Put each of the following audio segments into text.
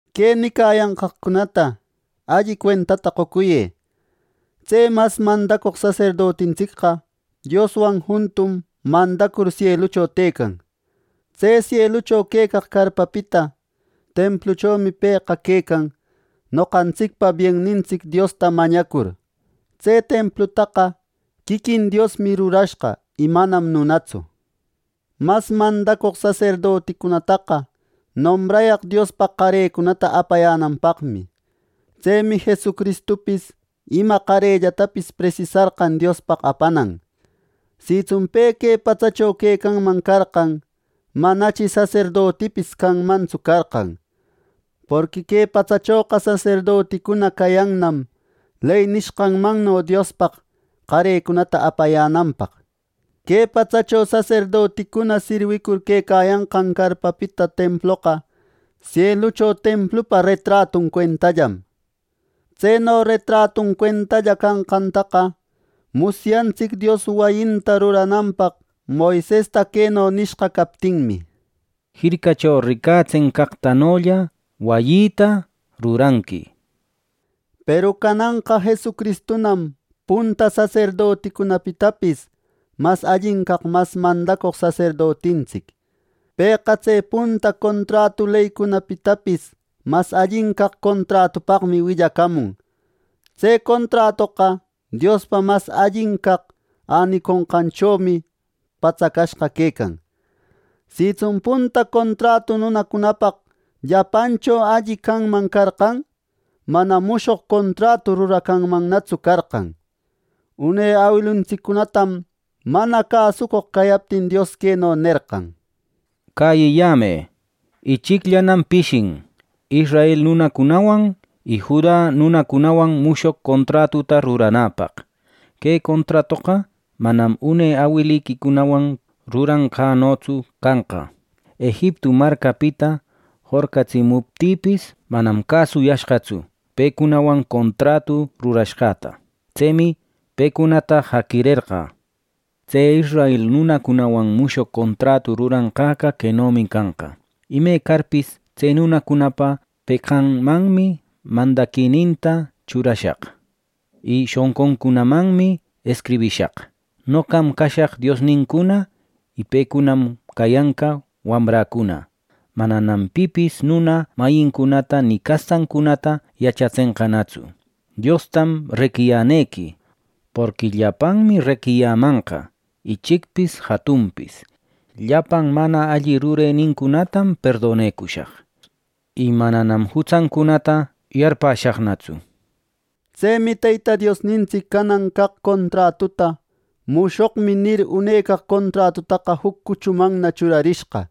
Que nicayancaqcunata alli cuentata qocuyë. Tse mas mandacoq saserdotintsicqa Dioswan juntum mandacur sielucho tëcan. Tse sielucho quecaq carpapita templuchomi pëqa quecan noqantsicpa biennintsic Diosta mañacur. Tse templutaqa quiquin Diosmi rurashqa, y manam nunatsu. Mas mandacoq saserdoticunataqa nombrayaq Diospaq qarecunata apayänanpaqmi. Tsemi Jesucristupis ima qarellatapis presisarqan Diospaq apanan. Sitsun pe que patsacho quecanman carqan, manachi saserdotipis canmantsu carqan, porqui que patsachoqa saserdoticuna cayannam ley nishqanmanno Diospaq qarecunata apayänanpaq. Que patsacho saserdoticuna sirwicur quecayanqan carpapita temploqa sielucho templupa retratun cuentallam. Tseno retratun cuentalla canqantaqa musyantsic, Dios wayinta rurananpaq Moisesta queno nishqa captinmi “Jircacho ricatsenqaqtanolla wayïta ruranqui” nir. Peru cananqa Jesucristunam punta saserdoticunapitapis mas allin caq mas mandacoq saserdotintsic. Pëqa tse punta contratu leycunapitapis mas allin caq contratupaqmi willacamun. Tse contratoqa Diospa mas allin caq äniconqancunachomi patsacashqa quecan. Sitsun punta contratu nunacunapaq llapancho alli canman carqan, manam mushoq contratu ruracanmannatsu carqan. Une awiluntsiccunatam mana cäsucoq cayaptin, Dios queno nerqan: “Cäyiyämë, ichicllanam pishin israel nunacunawan y Juda nunacunawan mushoq contratuta ruranapaq. Que contratoqa manam une awiliquicunawan ruranqänotsu canqa. Ejiptu marcapita jorqatsimuptïpis manam cäsuyashqatsu pecunawan contratu rurashqäta. Tsemi pecunata jaqirerqä” ninmi Dios. “Tse israel nunacunawan mushoq contratu ruranqäqa quenomi canqa: Ime carpis, tse nunacunapa peqanmanmi mandaquinïta churashaq y shonquncunamannam escribishaq. Noqam cashaq Diosnincuna, y pecunam cayanqa wamräcuna. Mananam pipis nuna mayincunata ni castancunata yachatsenqanatsu, ‘¡Diostam reqiyänequi!’ nishpa; porqui llapanmi reqiyämanqa, ichicpis jatunpis. Llapan mana alli rurenincunatam perdonecushaq, y mananam jutsancunata yarpäshaqnatsu” ninmi Dios. Tsemi Teyta Diosnintsic canan caq contratuta “Mushoqmi” nir, unecaq contratutaqa juc cuchumanna churarishqa,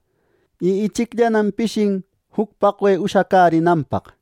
y ichicllanam pishin juc paqwe ushacärinanpaq.